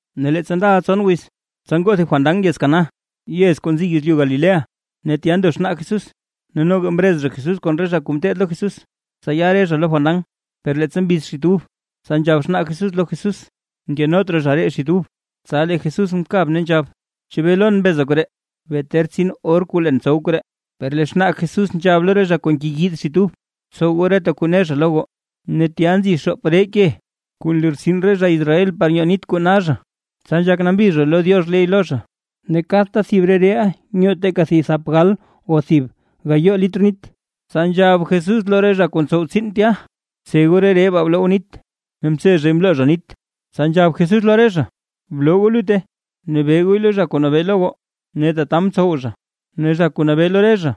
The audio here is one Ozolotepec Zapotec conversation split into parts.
Ne leettsa ndaʼa tson wiz, tsa ngoo thib fandan yez Caná, yez kuu nzi yezlyu Galilea. Ne tya ndo xnaa Jesús, ne noga mrez zha Jesús kon re zha kuu ngeteed lo Jesús, tsa ya re zha lo fandan. Per leettsa mbiz xit ub, tsa nzhab xnaa Jesús lo Jesús: ―Nkenot raa zha ree xit ub. Tsa lee Jesús mkab ne nzhab: ―¿Chebee lon mbeza koree? Bee ter tsin or kuu leen tsow koree. Per lee xnaa Jesús nzhab lo re zha kuu ngeyiid xit ub: ―Btsow goo reta kuu ne zha lo goo. Ne tya nzi xoop ree ke, kuu nlortsin re zha Israel par nyoo nit kuu na zha, tsa nzhak nambi zha lo Diox ley lo zha. Ne kadta thib re reeʼa nyoo teeka thap gal o thib gayoo litr nit. Tsa nzhab Jesús lo re zha kuu ntsow tsiin tya: ―Btse goo re ree baa bloo goo nit. Ne mtse zhay mloo zha nit. Tsa nzhab Jesús lo re zha: ―Bloo goo lutte, ne be gooy lo zha kuu nabee lo goo. Ne tata mtsow zha. Ne lee zha kuu nabee lo re zha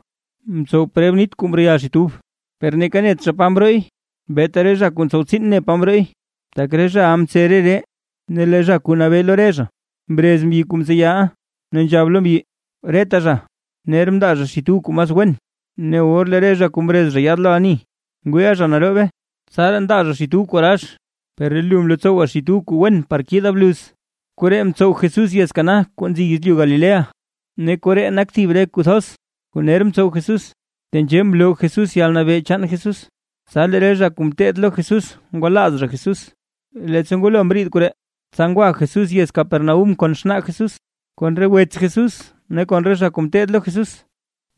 mtsow preb nit kuu mreyal xit ub, per neeka net zha pa mrooy, beeta re zha kuu ntsow tsiin ne pa mrooy, tak re zha mtse re ree. Ne lee zha kuu nabee lo re zha mrez mbyi kuu mtseyaʼa, ne nzhab zha lo mbyi: ―Reta zha, ner ndaa zha xit ub kuu mas wen, ne or lee re zha kuu mrez zha yaad lo ani ngwiiʼa zha naroobe, tsaraa ndaa zha xit ub kuu rax. Per lee lu mlotsowa xit ub kuu wen par kiida bluz. Koree mtsow Jesús yez Caná kuu nzi yezlyu Galilea, ne koree nak thib re kuu thoz, kuu ner mtsow Jesús, tenzhee mloo Jesús yalnabee chaan Jesús, tsa lee re zha kuu ngeteed lo Jesús ngwalaaz zha Jesús. Leettsa ngwalo mriid koree, tsa ngwa Jesús yez Capernaúm kon xnaa Jesús, kon re wets Jesús ne kon re zha kuu ngeteed lo Jesús,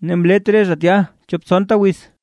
ne mlet re zha tya chop tsonta wiz.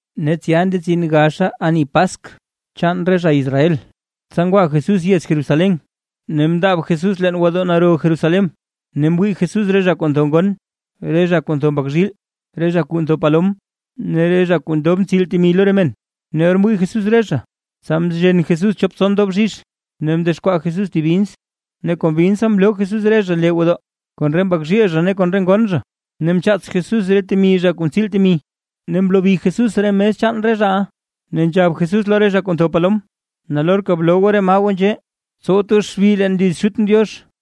Ne tsya ndetsin gaxa ani Paskw chaan re zha Israel, tsa ngwa Jesús yez Jerusalén. Ne mndaab Jesús roo gwodoo naro Jerusalén, ne mwii Jesús re zha kuu ntho ngon, re zha kuu ntho mbak zhiil, re zha kuu ntho palom, ne re zha kuu ndob ntsiil temi lo re men. Ne or mwii Jesús re zha, tsa mzhen Jesús chop tson doo bzhizh ne mdexkwaa Jesús thib bins, ne kon binsa mloo Jesús re zha lee gwodoo kon re mbak zhiil zha ne kon re ngon zha. Ne mchaats Jesús re temi re zha kuu ntsiil temi, ne mlobi Jesús re mes chaan re zhaʼa. Ne nzhab Jesús lo re zha kuu ntho palom: ―¡Nalorka bloo goo re maa goo nzhee! ¡Tsowt goo xbi leen liz Xutʼn Diox!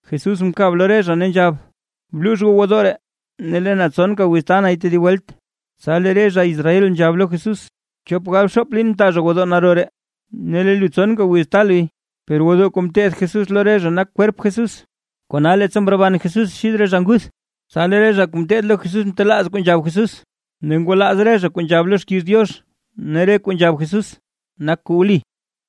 Jesús mkab lo re zha ne nzhab: ―Bluux goo gwodoo ree, ne lee na tsonka wiz taa nay tedib welt. Tsa lee re zha Israel nzhab lo Jesús: ―Chop galbxoop liin mta zha gwodoo naro ree, ¿ne lee lu tsonka wiz taa luy? Per gwodoo kuu mteth Jesús lo re zha nak kwerp Jesús. Kona leettsa mroban Jesús xid re zha nguth, tsa lee re zha kuu ngeteed lo Jesús mtelaaz kuu nzhab Jesús, ne ngwalaaz zha re kuu nzhab lo xkiiz Diox ne re kuu nzhab Jesús, nak kuu wli.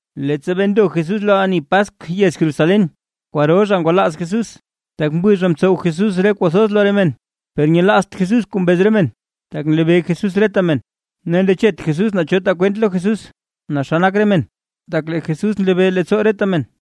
Leettsa bee ndo Jesús lo ani Paskw yez Jerusalén, kwaro zha ngwalaaz Jesús, tak mwii zha mtsow Jesús re kuu thoz lo re men. Per nyelaazt Jesús kuu mbez re men, tak nlebee Jesús reta men. Ne ndechet Jesús naa cho taa kwent lo Jesús naa xa nak re men, tak lee Jesús nlebee leettsoo reta men.